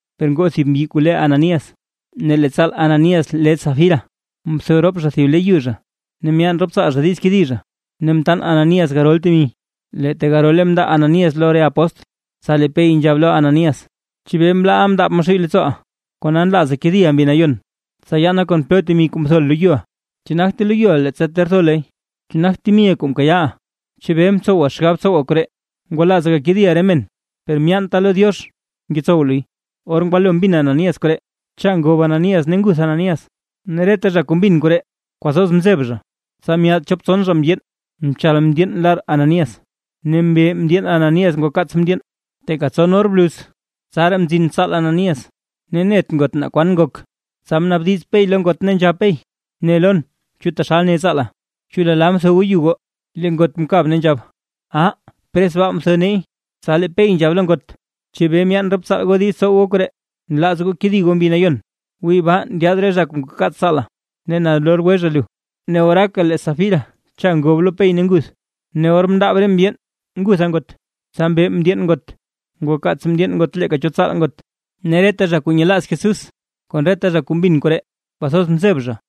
Per ngoo thib mbyi kuu le Ananías ne lee tsaal Ananías le Safira. Mtho rop zha thib le yu zha. Ne myaan rop tsaal zha diiz kedi zha, ne mtaan Ananías garol temi, lee tegarole mndaa Ananías lo re apóstl. Tsa lee Pey nzhab lo Ananías: ―¿Chebee mlaaʼa mndaab Maxuuy leettsooʼa, kona nlaaza kediʼa Mbi Nayon, tsa yaana kon plo temi kuu mthoʼa loyuʼa? ¿Chu nagte loyuʼa leettsa ter tho luy? ¿Chu nagt temiʼa kuu mkayaaʼa? ¿Chebee mtsowa xgab tsowa koree? Ngwalaaza gakediʼa re men per myeenta lo Diox ngetsow luy. Or ngwalo mbin Ananías koree, cha ngob Ananías ne nguth Ananías. Ne reta zha kuu mbin koree kwathoz mzeb zha. Tsa myaad chop tson zha mndyeen, mchal mndyeen lar Ananías ne mbe mndyeen Ananías ngwakaats mndyeen. Teeka tson or bluz, tsaraa mzin tsaal Ananías, ne net ngot naa kwan ngok. Tsa mnaabdiz Pey lo ngot, ne nzhab Pey: ―Ne lon, ¿chu taxal ne tsaala? ¿Chu lala mtho goo yu goo? Lee ngot mkab ne nzhab: ―Ah, pres baa mtho neey. Tsa lee Pey nzhab lo ngot: ―¿Chebee myaan rop tsaal goo diiz tsow goo koree, nlaaz goo kedi goo Mbi Nayon? Wii baa ndyaad re zha kuu ngwakaats tsaala, ne nalor gwe zha lu. Ne oraaka lee Safira cha ngob lo Pey ne nguth. Ne or mndaab re mndyeen ngutha ngot, tsa mbe mndyeen ngot, ngwakaats mndyeen ngot leeka cho tsaal ngot. Ne reta zha kuu nyelaaz Jesús kon reta zha kuu mbin koree, kwathoz mzeb zha.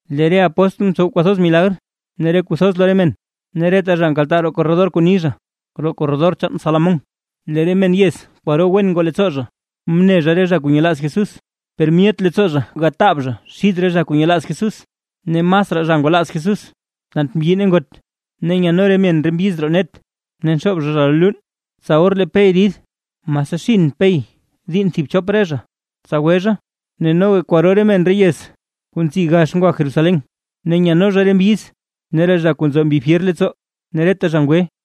Lee re apóstl mtsow kwathoz milagr ne re kuu thoz lo re men; ne reta zha nkaltaa roo korredor kuu ni zha, roo korredor chaan Salomón. Lee re men yez kwaro wen ngoo leettsoo zha mne zha re zha kuu nyelaaz Jesús, per myet leettsoo zha gataab zha xid re zha kuu nyelaaz Jesús. Ne masraa zha ngwalaaz Jesús tant mbyi ne ngot. Ne nyadno re men re mbyiz roo net ne nxoob zha zha lo luun, tsa or lee Pey rid, mase xinn Pey diinn thib chop re zha, tsa gwe zha. Ne noga kwaro re men re yez kuu nzi gax ngwa Jerusalén, ne nyadno zha re mbyiz ne re zha kuu nzo mbi fyer leettsoo. Ne reta zha ngwe.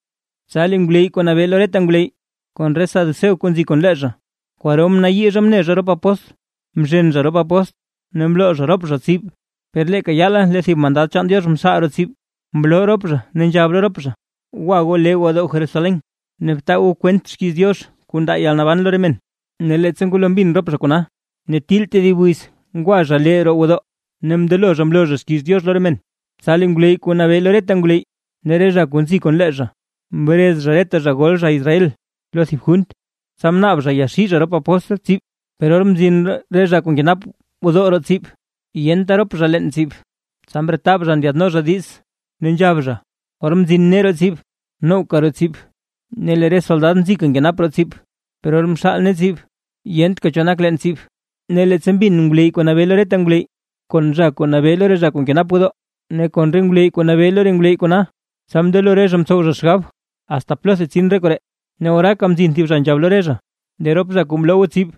Tsa lee ngwleyy kuu nabee lo reta ngwleyy kon re saduceo kuu nzi kon lee zha, kwaro mnayii zha mne zha rop apóstl, mzhen zha rop apóstl, ne mloo zha rop zha tsib. Per leeka yaala lee thib mandad chaan Diox mxaal roo tsib, mloo rop zha ne nzhab lo rop zha: ―Gwa goo lee gwodoo Jerusalén, ne btaa goo kwent xkiiz Diox kuu ndaa yalnaban lo re men. Ne leettsa ngwalo mbin rop zha kona, ne til tedib wiz ngwa zha lee roo gwodoo ne mndelo zha mloo zha xkiiz Diox lo re men. Tsa lee ngwleyy kuu nabee lo reta ngwleyy, ne re zha kuu nzi kon lee zha, mrez zha reta zha gol zha Israel lo thib junt, tsa mnaab zha yaxii zha rop apóstl tsib. Per or mzin re zha kuu nkenap gwodoo roo tsib, yenta rop zha leen tsib, tsa mretab zha ndyaadno zha diiz, ne nzhab zha: ―Or mzin nee roo tsib, nowka roo tsib, ne lee re soldad nzika nkenap roo tsib. Per or mxaal nee tsib, yentka cho nak leen tsib. Ne leettsa mbin ngwleyy kuu nabee lo reta ngwleyy kon zha kuu nabee lo re zha kuu nkenap gwodoo, ne kon re ngwleyy kuu nabee lo re ngwleyy kona, tsa mndelo re zha mtsow zha xgab: “¿Asta plotha tsin re koree?” Ne oraaka mzin thib zha nzhab lo re zha: ―Lee rop zha kuu mloo goo tsib,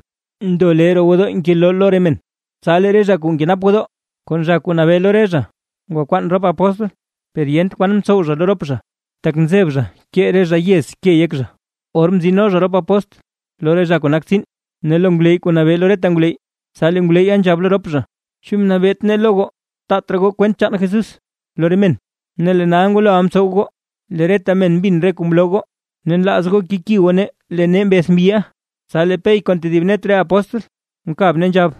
ndo lee roo gwodoo ngeloo lo re men. Tsa lee re zha kuu nkenap gwodoo kon zha kuu nabee lo re zha, ngwakwaan rop apóstl, per yent kwan mtsow zha lo rop zha, tak nzeb zha kee re zha yez ke yek zha. Or mtsino zha rop apóstl lo re zha kuu nak tsiin ne lo ngwleyy kuu nabee lo reta ngwleyy. Tsa lee ngwleyya nzhab lo rop zha: ―¿Chu mnet nee lo goo taat raa goo kwent chaan Jesús lo re men? Ne lee nal ngwaloʼa mtsow goo, lee reta men mbin re kuu mloo goo, ne nlaaz goo keki goo nee lee nee mbeth mbyiʼa. Tsa lee Pey kon tedib net re apóstl mkab, ne nzhab: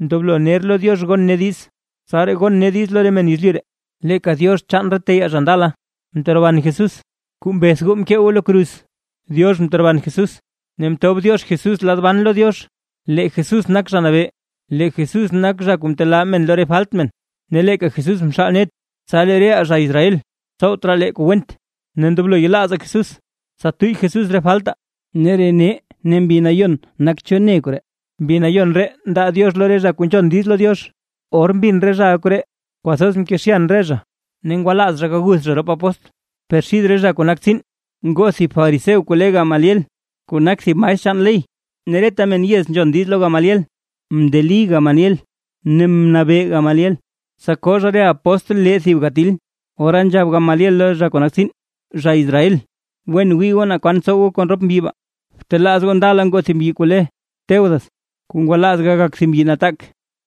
―Ndoblo ner lo Diox gon nee diiz, tsaraa gon nee diiz lo re men yezlyu ree. Leeka Diox chaan re teyaa zha ndala, mteroban Jesús, kuu mbeth goo mkee goo lo kruz. Diox mteroban Jesús, ne mtob Diox Jesús lad ban lo Diox, lee Jesús nak Zha Nabee, lee Jesús nak zha kuu ntelaa re men lo re falt men, ne leeka Jesús mxaal net, tsa lee reʼaa zha Israel tsowt raa lee kuu went, ne ndoblo yelaazaa Jesús, tsa tuyy Jesús re faltaa. Ne re nee ne Mbi Nayon nak cho ne koree, Mbi Nayon ree ndaa Diox lo re zha kuu nzhon diiz lo Diox. Or mbin re zhaʼa koree, kwathoz mkezhyan re zha, ne ngwalaaz zha gaguth zha rop apóstl. Per xid re zha kuu nak tsiin, ngoo thib fariseo kuu le Gamaliel, kuu nak thib maestr chaan ley, ne reta men yez nzhon diiz lo Gamaliel. Mndeli Gamaliel ne mnabee Gamaliel, tsa koo zha re apóstl lee thib gatil. Ora nzhab Gamaliel lo re zha kuu nak tsiin: ―Zha Israel, wen wii goo naa kwan tsow goo kon rop mbyi baa. Btelaaz goo ndala ngoo thib mbyi kuu le Teudas, kuu ngwalaaz gagak thib mbyi nataak,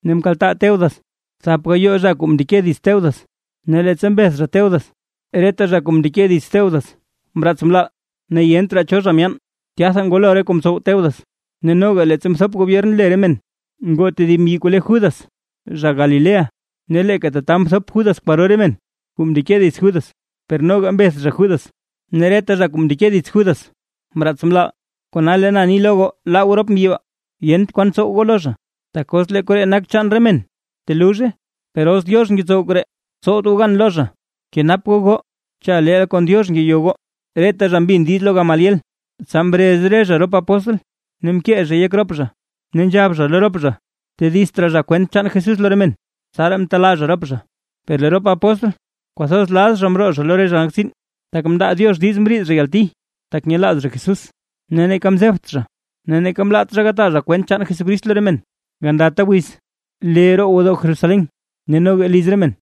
ne mkaltaa Teudas thap gayoo zha kuu mndeke dits Teudas, ne leettsa mbeth zha Teudas, reta zha kuu mndeke dits Teudas mraats mlaal, ne yent raa cho zha myaan. Tyatha ngwalo re kuu mtsow Teudas. Ne noga leettsa mthop gobyern le re men, ngoo tedib mbyi kuu le Judas zha Galilea. Ne leeka tata mthop Judas kwaro re men kuu mndeke dits Judas, per noga mbeth zha Judas, ne reta zha kuu mndeke dits Judas mraats mlaal. Kona lee na ni lo goo laa goo rop mbyi baa, yent kwan tsow goo lo zha. Tak os lee koree nak chaan re men, teluzhe. Per os Diox ngetsow koree, tsowt goo gan lo zha, kenap goo goo cha leel kon Diox ngeyo goo. Reta zha mbin diiz lo Gamaliel. Tsa mrez re zha rop apóstl ne mkee zhay yek rop zha, ne nzhab zha lo rop zha, tedizt raa zha kwent chaan Jesús lo re men. Tsaraa mtelaa zha rop zha. Per lee rop apóstl kwathoz laz zha mroo zha lo re zha nak tsiin, tak mndaa Diox diiz mriid zha yalti, tak nyelaaz zha Jesús. Ne neeka mzebt zha ne neeka mlaat zha gataa zha kwent chaan Jesucrist lo re men gandata wiz, lee roo gwodoo Jerusalén ne noga liz re men.